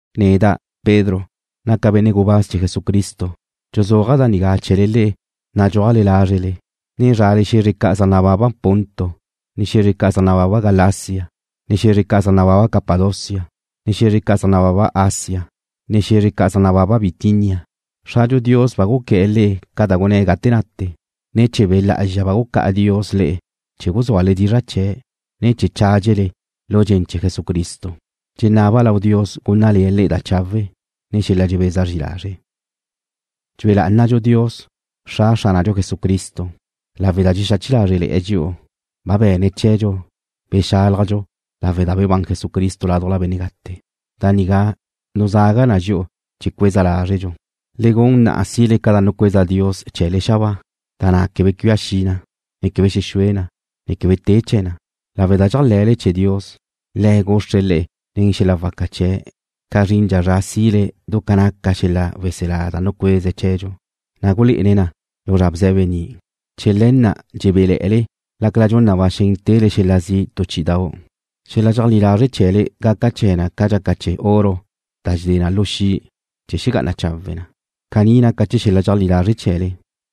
Neda', Pedro, naca' benne' gubáz chee̱ Jesucristo. Dxuzúaja' da nigá chee̱le le'e nadxúajle lázrele, ne zrale xe̱zre ca' zaj nababa Ponto, ne xe̱zre ca' zaj nababa Galacia, ne xe̱zre ca' zaj nababa Capadocia, ne xe̱zre ca' zaj nababa Asia, ne xe̱zre ca' zaj nababa Bitinia. Xradxu Dios ba guqué̱'e̱ le'e ca da gunné̱' gate nate. Ne̱ chee̱ Be' Lá'azxa ba gucá'a Dios le'e chee̱ guzúale dizra' chee̱', ne chee̱ chádxele lu dxen chee̱ Jesucristo. Dxenaba' lau Dios gúnnale̱'e̱ le'e da chawe', ne xel-la' dxebeza zri lazre'. Dxue lá'anadxu Dios, Xra Xránadxu Jesucristo. Lawe' da dxexache lázrele̱'e̱ dxi'u ba be̱ne̱' chee̱dxu bexálajdxu lawe' da bebán Jesucristo ládujla benne' gate. Da nigá nuzaga na dxi'u chee̱ cueza lázredxu, ne gun na sile ca da nucueza Dios chee̱le xabáa, da na' quebe cuia xi na, ne quebe xexúe na, ne quebe te chee̱ na. Lawe' da dxéajle̱le chee̱ Dios, Le̱' guxre̱' le'e nen xel-la' waca chee̱' ca zrindxa zra na' sile du ca naca xel-la' weselá da nucueze̱' chee̱dxu, na' gulé'ene̱' na lu zra bze̱be ni'. Chee̱ le̱ na' dxebéle̱'e̱le lácala dxun na ba xen tele xel-la' zi' tu chí'idau'. Xel-la' dxeajlí lazre' chee̱le gaca chee̱ na ca dxaca chee̱ oro da dxedé na lu xi' chee̱ xegá'ana chawe' na. Caní naca chee̱ xel-la' dxeajlí lazre' chee̱le,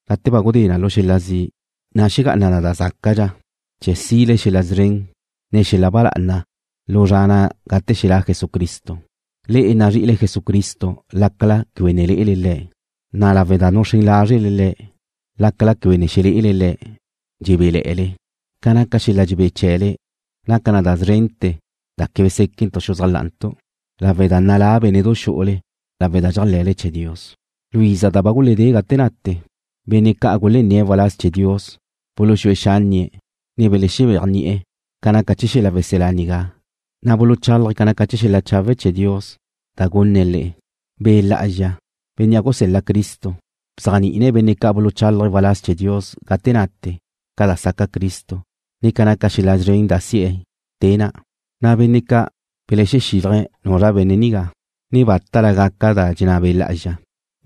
gate ba gudé na lu xel-la' zi', na' xegá'ana na da zácadxa chee̱ sile xel-la' szren, ne xel-la' ba lá'ana lu zra na' gate xelá' Jesucristo. Le'e nazri'ile Jesucristo lácala quebe ne lé'ele Le̱', na' lawe' da nuxrén lázrele Le̱' lácala quebe ne xelé'ele Le̱', dxebéle̱'e̱le. Ca naca xel-la' dxebé chee̱le naca na da zrente̱ da quebe séquentu' xuzájla'antu' lawe' da nalá bénne'du xu'ule lawe' da dxéajle̱le chee̱ Dios. Lu iza da ba guledé gate nate, benne' ca' gulenné̱' waláz chee̱ Dios buluxúe xánnie̱', ne belexebéajni'e̱ ca naca chee̱ xel-la' weselá nigá, na' buluchálaje̱' ca naca xel-la' chawe' chee̱ Dios da gunne̱' le'e. Be' Lá'azxa, Bénnea' gusel-la Cristo, bzéajni'ine̱' benne' ca' buluchálaje̱' waláz chee̱ Dios gate nate ca da saca Cristo, ne ca naca xel-la' szren da si'e̱ te na', na' benne' ca' belexexílaje̱' nuzra benne' nigá, ne bátala gaca da dxenná Be' Lá'azxa,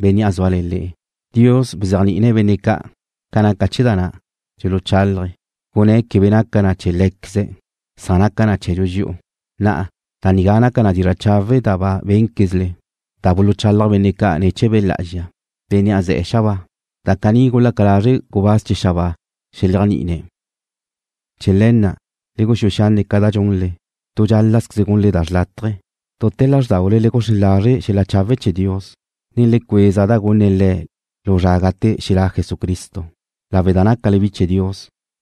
Bénnea' zúale̱ le̱'. Dios bzéajni'ine̱' benne' ca' ca naca chee̱ da na' dxuluchálaje̱', gunné̱' quebe naca na chee̱ lé̱queze̱', san naca na chee̱dxu dxi'u. Na'a, da nigá naca dizra' chawe' da ba bénquezle, da buluchalaj benne' ca' ne̱ chee̱ Be' Lá'azxa, Bénnea' ze̱'e̱ xabáa. Da caní gulaca lazre' gubáz chee̱ xabáa xeléajni'ine̱'. Chee̱ le̱ na', le guxúe xanne' ca da gunle. Tu dxál-lazqueze gunle da xrlátaje. Dute̱ lázrdaule le guxrén lazre' xel-la' chawe' chee̱ Dios, ne le cueza da gunne̱' le'e lu zra na' gate xelá' Jesucristo. Lawe' da nácale bi chee̱ Dios,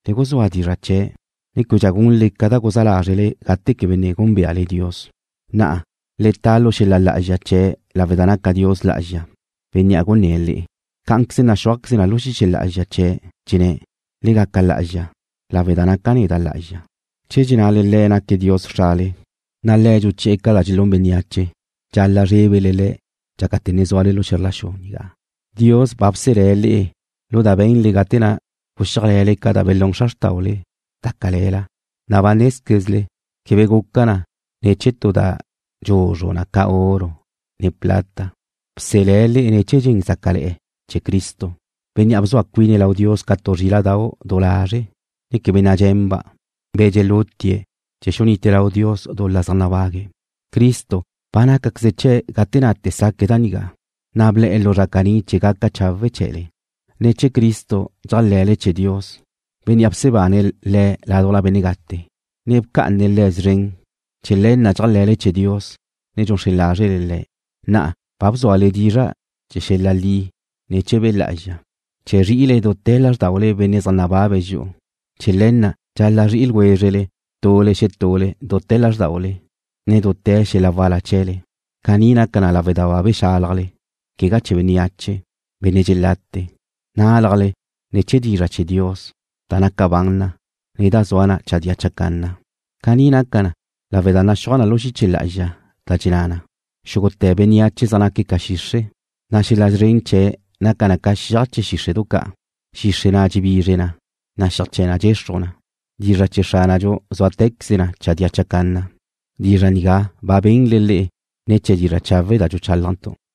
le guzúa dizra' chee̱', ne québedxa gunle ca da guzá lázrele gate quebe ne gúnbeale Dios. Na'a, le ta lu xel-la' lá'azxa chee̱' lawe' da naca Dios lá'azxa, Bénnea' gunné̱' le'e. Cá'anqueze naxúajqueze na lu xiche lá'azxa chee̱', dxenné̱': “Le gaca lá'azxa, lawe' da naca' neda' lá'azxa.” Che dxennale le'e naca Dios Xrale, na' Le̱' dxuchi'e̱ ca da dxelún bénneache, dxal-la' zrébele Le̱' dxácate̱ ne zúale lu xe̱zr la xu nigá. Dios ba bselé̱' le'e lu da benle gate na' guxíajle̱le ca da belún xra xrtaule, da cale̱la, na' ba nézquezle quebe guca na ne̱ chee̱ tu da dxuzru na ca oro, ne plata. Bselé̱' le'e ne̱ chee̱ dxen zácale̱'e̱ chee̱ Cristo, Bénnea' bzua cuine̱' lau Dios ca tu zríla'dau' du lazre', ne quebe nadxenba', be̱ dxelutie̱' chee̱ xunite lau Dios dul-la zaj nabague̱'. Cristo ba nácaqueze chee̱' gate nate saque̱' da nigá, na' ble̱'e̱ lu zra caní chee̱ gaca chawe' chee̱le. Ne̱ chee̱ Cristo dxéajle̱le chee̱ Dios, Bénnea' bsebane̱' Le̱' ládujla benne' gate, ne bca'ane̱' Le̱' szren. Chee̱ le̱ na' dxéajle̱le chee̱ Dios, ne dxuxrén lázrele Le̱'. Na'a, ba bzúale dizra' chee̱ xel-la' li ne̱ chee̱ Be' Lá'azxa, chee̱ zri'ile dute̱ lázrdaule benne' zaj nababe̱' dxi'u. Chee̱ le̱ na' dxal-la' zri'ile ljwézrele tule xetule dute̱ lázrdaule, ne dute̱ xel-la' wala chee̱le. Caní naca na lawe' da ba bexálajle, quegá chee̱ bénneache, benne' dxelate. Nálajle ne̱ chee̱ dizra' chee̱ Dios, da naca ban na, ne da zua na chadía chacanna. Caní naca na lawe' da naxúaj na lu xiche lá'azxa, da dxenná na: Xúgute̱ bénneache zaj naque̱' ca xixre', na' xel-la' szren chee̱' naca na ca xiaj chee̱ xíxre'du ca'. Xixre' na' dxebizre na, na' xiaj chee̱ na dxexruj na. Dizra' chee̱ Xránadxu zúatequeze na chadía chacanna. Dizra' nigá ba benle le'e ne̱ chee̱ dizra' chawe' da dxuchálajntu'.